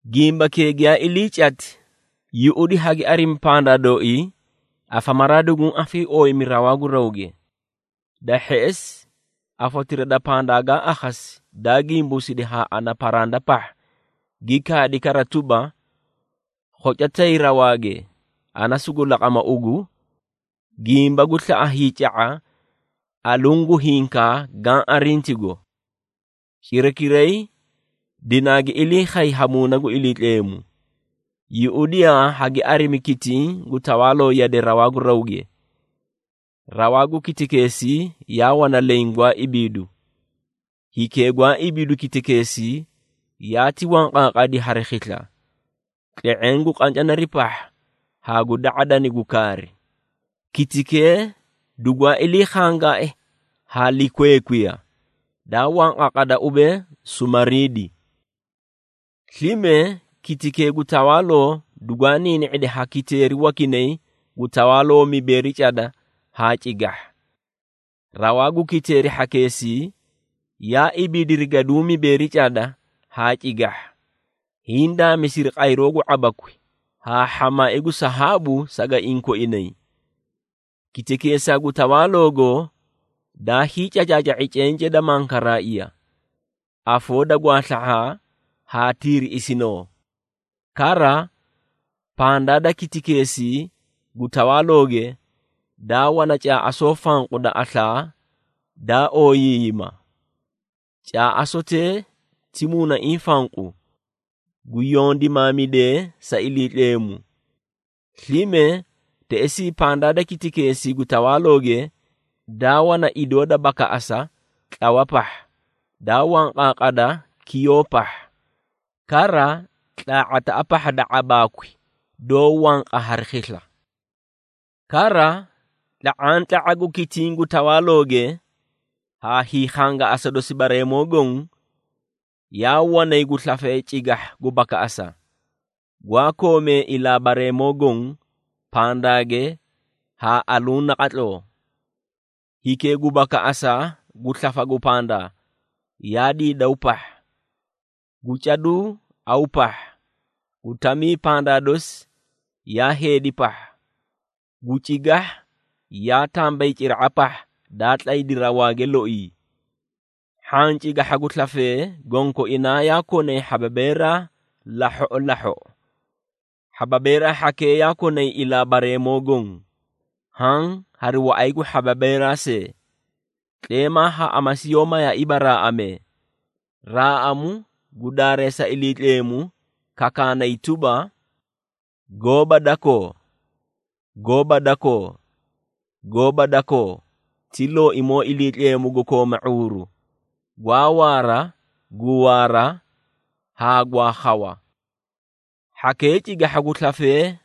Gimbakee giyaa ilii cati, yuꞌudi hagi arimi pandaa dooii, afamaraa duguũ afiiooyimi rawaa gu rawge. Da hheꞌesi, afotira da pandaa gaa akhasi daa gimbuusidi haa ana paranda pahha, gi kaadi kara tuba, “Khoca tay rawaage, ana sugu laqama ugu, gimba gu slaꞌa hiica⁄a, aluũ gu hinkaa gaã arintigo.” Cirakiray dinaagi ilii khay ha Muuna gu Iliitleemu. Yuꞌudiyaa hagi arimi kitiĩ gu tawaaloo yade rawaa gu rawge. Rawaa gu kitikeesii yaa wana leẽ gwaa ibiidu. Hikee gwaa ibiidu kitikeesii, yaati wanqaaqadi hari khisla, tle⁄eẽ gu qancanari pahha haa gu da⁄adani gu kaari. Kitikee dugwaa iliikhangai ha likweekwiya, daa wanqaaqada ubee sumariidi. Slime, kitikee gu tawaaloo dugwaa niini⁄idi ha kiteeri wakinay gu tawaaloo mibeeri cada haa cigahha. Rawaa gu kiteeri hhakeesii, yaa ibiidiri gaduũ mibeeri cada haa cigahha, hiĩ daamisiri qayroo gu ⁄abakwi, haa hhamaai gu sahaabu sagaiĩ koinay. Kitikeesaa gu tawaaloogo, daa hiicacaaca⁄i cencee da mankaraaiya, afoo da gwaasla⁄aa haa tiiriꞌisinoo. Kara, pandaa da kitikeesii gu tawaalooge daa wana caaꞌasoo fanqu da aslaa daa ooyiiyima. Caaꞌasotee ti muunaiĩ fanqu, gu yondimaamidee sa Iliitleemu. Slime, teꞌesii pandaa da kitikeesii gu tawaalooge, daa wana idoo da bakaꞌasa tlawa pahha, daa wanqaaqada kiyoo pahha. Kara tlaa⁄ataꞌa pahha da ⁄abaakwi doó wanqa hari khisla. Kara, tla⁄antla⁄a gu kitiĩ gu tawaalooge, haa hiikhangaꞌasa dosi bareemoo goõ, yaa wanay gu slafee cigahha gu bakaꞌasa, gwaa koomee ilaa bareemoo goõ, pandaage haa aluũ naqatloo. Hikee gu bakaꞌasa gu slafa gu pandaa, yaa diidaw pahha, gu caduu aw pahha, gu tamii pandaa dosi yaa heedi pahha, gu cigahha yaa tambayciraꞌa pahha daa tlaydi rawaage loii. Hhaã cigahha gu slafee, gonkoinaa yaa konay hhababeeraa lahhoꞌo lahhoꞌo. Hhababeerii hhakee yaa konay ilaa bareemoo goõ, haã hari waꞌay gu hhababeeraa see. Tleemaa haa amasi yoó mayaaiiba raaꞌamee, raaꞌamu gu daareesa Iliitleemu kakaanay tuba, “Gooba dakoo, Gooba dakoo, Gooba dakoo, ti Looimoo Iliitleemu gu kooma ⁄uuru, gwaa waara, gu waara haa gwaa khawa.” Hhakee cigahha gu slafee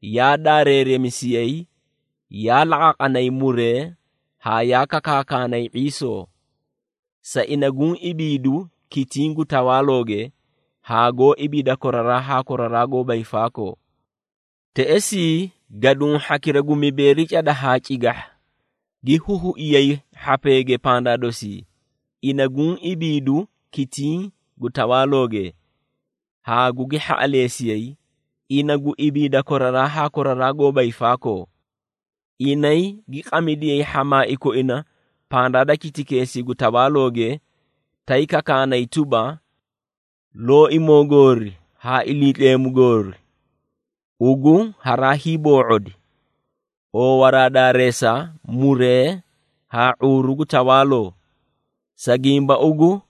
yaa daareeremisiyay, yaa laqaaqanay muree haa yaa kakaakanay ⁄iisoo, sa ina guũ ibiidu kitiĩ gu tawaalooge haa goó ibiida koraraa haa koraraa goóba hiifaakoo. Teꞌesii gaduũ hhakira gu mibeeri cada haa cigahha, gi huhuiyay hhapeege pandaa dosii ina guũ ibiidu kitiĩ gu tawaalooge, haa gugi hhaꞌaleesiyay, ina gu ibiida koraraa haa koraraa goóba hiifaakoo. Inay gi qamidiyay hhamaai koina pandaa da kitikeesii gu tawaalooge, tay kakaanay tuba, “Looimoo goori haa Iliitleemu goori, Ugu haraa hiiboo⁄odi, oowaraa daareesa, muree haa ⁄uuru gu tawaaloo. Sa gimba ugu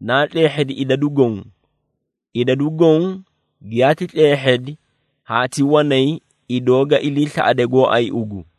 naa tleehhedi idadu goõ, idadu goõ giyaati tleehhedi haa ti wanay idoo ga iliislaꞌade gooay ugu.”